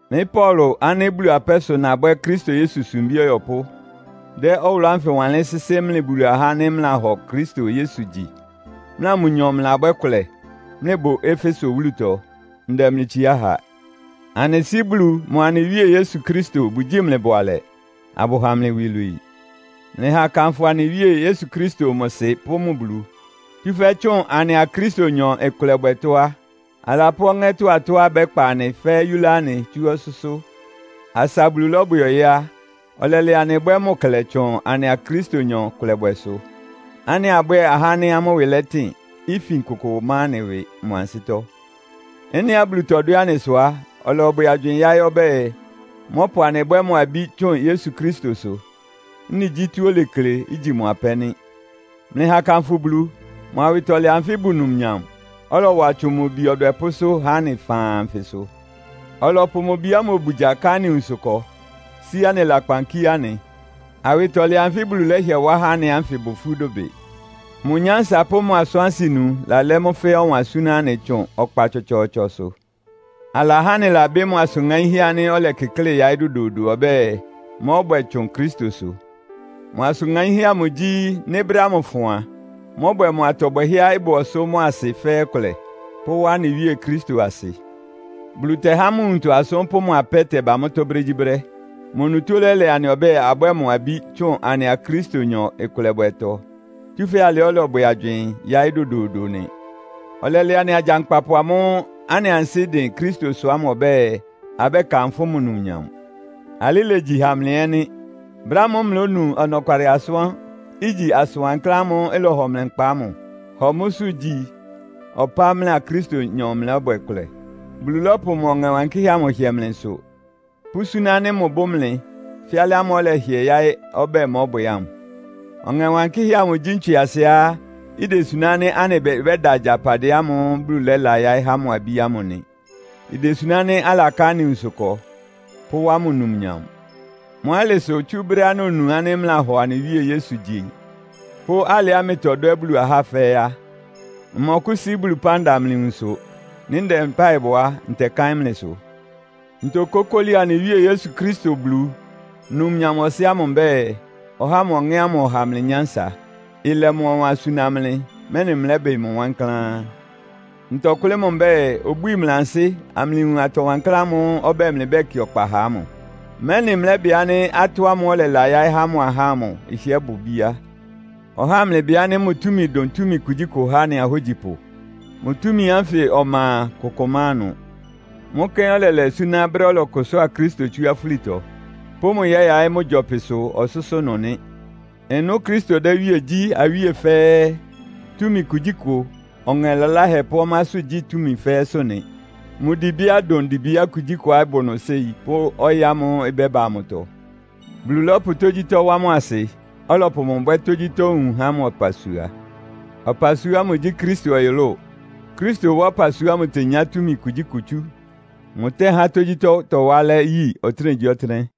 Mɩ́ Paulo ánɩ́ Bulu apɛ́ sʋ nabwɛ́ Kristo Yesu sumbí ɔyɔpʋ́, dɛ́ ɔwʋlʋ́ ánfɩ wanlɩ́n sɩ́sɩ́ mlɩ Bulu ahá ánɩ́ mlɩlahɔ Kristo Yesu gyi, mlɩa mʋnyɔ mlɩlabwɛ́ kʋlɛ, mlɩbʋ Efeso wúlutɔ. Ndɛ mlɩ itsiá ha. Anɩ Sɩ́ Bulu mʋa anɩ Wíe Yesu Kristo bʋgyíi mlɩ bʋalɛ, abʋha mlɩ iwilwii. Mlɩha akanfʋ anɩ Wíe Yesu Kristo mʋ Sɩ pʋ́ mʋ Bulu. Tsúfɛ́ tsʋn anɩa Kristonyɔ ɩkʋlɛbwɛtɔ́ á, alapʋ́ ɔŋɛ́tɔ́ atɔ́á ɩbɛ́kpa anɩ fɛ́ɛ́ yúlá anɩ tsú ɔsʋ́sʋ́. Asa Bulu lɔ́bwɛ ɔyɩ́ á, ɔlɛlɛ anɩ bwɛ́ mʋ klɛ tsʋn anɩa Kristonyɔ kʋlɛbwɛsʋ, ánɩ́ abwɛ́ɛ ahá ánɩ́ amʋ́ ɩwɩ lɛtɩn, ifin kʋkʋ má anɩ ɩwɩ mʋ ansɩ́tɔ́. Ɩ́nɩá Bulu tɔdwɛ́ anɩ sʋ á, ɔlɔbwɛ agywɩɩn yáɩ́ ɔbɛ́ɛ, mɔ́pʋ anɩ bwɛ́ mʋ abí tsʋn Yesu Kristosʋ. Ɩ́nɩ gyí tɔ́á olekle, igyi mʋ apɛ́ nɩ́. Mlɩha akanfʋ Bulu, mʋ awɩtɔlɛ anfɩ́ ɩbʋ numnyam, ɔlɔwa tsʋn mʋ Bi ɔdwɛpʋ́sʋ́ há anɩ faan anfɩ sʋ. Ɔlɔpʋ mʋ Bi ámʋ obugya ká anɩ nwunsʋ ɩkɔ, sí anɩ lakpan kíé anɩ. Awɩtɔlɛ anfɩ́ Bulu lɛ́hɩɛ wá há anɩ ánfɩ ɩbʋ ifú dʋbɩ. Mʋ nyánsa pʋ́ mʋ asʋ́n-asɩnu lalɛ́ mʋ́ fɛ́ɛ́ ɔwan súná anɩ tsʋn ɔkpa tsɔtsɔɔtsɔsʋ. Alahá anɩlabɩ́ mʋ asʋn ŋaínhɛ́ ánɩ́ ɔlɛkɩklɩ́ yáɩ́ dodoodo ɔbɛ́ɛ, mɔ́bwɛ tsʋn Kristosʋ. Mʋ asʋn ŋaínhɛ́ amʋ gyí, nɩ́ brɛ́ ámʋ ɩfʋn a, mɔ́bwɛ mʋ atɔ bwɛhɛ́á ɩbʋ ɔsʋ́ mʋ́a asɩ fɛ́ɛ́ kʋlɛ, pʋ́wá anɩ Wíe Kristo asɩ. Bulu tɛhá mʋ nwuntɔ asʋ́n pʋ́ mʋ apɛ́ tɛba mʋ́tɔ́ brégyíbrɛ́. Mʋ onutó lɛ́lɛ anɩ ɔbɛ́ɛ abwɛ́ɛ mʋ abí tsʋn anɩa Kristonyɔ ɩkʋlɛbwɛtɔ. Tsúfɛ́ alɩ́ ɔlɔbwɛ agywɩɩn yáɩ́ dodoodo nɩ. Ɔlɛlɛ anɩ agyankpapʋ ámʋ́ʋ́ anɩ ansɩ́ dɩn Kristosʋ ámʋ ɔbɛ́ɛ, abɛ́kanfʋ́ mʋ numnyam. Alɩ́ ilegyi ha mlɩ ɛ́ nɩ́. Brɛ́ ámʋ́ʋ́ mlɩlónu ɔnɔkwalɩ asʋ́n, igyi asʋn wankláán ámʋ́ʋ́ ɩlɔhɔ mlɩ nkpa ámʋ, hɔ mʋ́sʋ́ gyi ɔpá mlɩa Kristonyɔ mlɩlɔ́bwɛ kʋlɛ. Bulu lɔ́pʋ mʋ Ɔŋɛ Wankɩ́hɛ́ amʋ hɩɛ mlɩ nsʋ, pʋ́súná ánɩ́ mʋbʋ́ mlɩ, fɛ́ alɩ ámʋ́ʋ́ ɔlɛhɩɛ yaɩ́ ɔbɛ́ɛ mɔ́bwɛ ámʋ. Ɔŋɛ Wankɩ́hɛ́ amʋ gyí ntswɩasɩá idesuná ánɩ́ anɩ ɩbɩ bɛ́da agyapadɩɛ ámʋ́ʋ́ Bulu lɛ́la yáɩ́ há mʋ abí ámʋ nɩ. Idesuná ánɩ́ alaká anɩ nwunsʋ ɩkɔ, pʋ́wá mʋ numnyam. Mʋ́ alɩ sʋ, tsú brɛ́á nonu ánɩ́ mlɩlahɔ anɩ Wíe Yesu gyi, pʋ́ alɩá mlɩtɔdwɛ́ Bulu ahá fɛ́ɛ́ á, mmɔkʋ́sí Bulu ɩpán da mlɩ nwunsʋ. Nɩ́ ndɛ mpáɩ bɔ á, ntɛkáɩ́n mlɩsʋ. Ntokókóli anɩ Wíe Yesu Kristo Bulu, numnyam Ɔsɩ́ ámʋ mbɛ́ɛ, ɔhá mʋ Ɔŋɛ́ ámʋ ɔha mlɩ nyánsa. Ɩlɛ mʋ ɔwan súná mlɩ, mɛ́nɩ mlɛ́bɩ mʋ wankláán. Ntɔkʋ́lɩ́ mʋ mbɛ́ɛ, obwíi mlɩ ansɩ́, amlɩwun atɔ wankláán ámʋ́ʋ́ ɔbɛ́ɛ, mlɩbɛ́kɩ ɔkpa ha ámʋ, mɛ́nɩ mlɛ́bɩ ánɩ́ atɔ́ ámʋ́ʋ́ ɔlɛlayáɩ́ há mʋ ahá ámʋ ɩhɩ́ɛ́ bʋ bíá. Ɔhá amlɩbɩ ánɩ́ mʋ túmi dʋn túmi kugyíkʋ há anɩ ahógyipʋ. Mʋ túmi ánfɩ ɔma a, kʋkʋ má ɩnʋ. Mʋ́ kɛ́n ɔlɛlɛ súná brɛ́á ɔlɔkʋsʋ́a Kristo tsú afúlitɔ, pʋ́ mʋ yɛ́yaɩ́ mʋ gyɔpɩsʋ ɔsʋ́sʋ́ ɩnʋ nɩ́. Ɩnʋ́ Kristo dɛ́ iwíe gyí awíe fɛ́ɛ́, túmi kugyíkʋ, ɔŋɛ laláhɛ pʋ́ ɔmásʋ́gyí túmi fɛ́ɛ́sʋ́ nɩ. Mʋ dibia dʋn dibia kugyíkʋá ɩbʋ nʋ séi pʋ́ ɔyɩ́ ámʋ́ʋ́ ɩbɛ́ba amʋtɔ. Bulu lɔ́pʋ tógyítɔ́ wá mʋ asɩ, ɔlɔpʋ mʋ bwɛ́ tógyítɔ́ nwun há mʋ ɔpasua. Ɔpasua ámʋ gyí Kristo ɔyʋlʋ́ʋ. Kristo wá ɔpasua ámʋ tenyá túmi kugyíkʋ tsú. Mʋtɛ́há tógyítɔ́ tɔwá alɛ́ yi ɔtɩ́nɛgyíɔtɩ́nɛ́.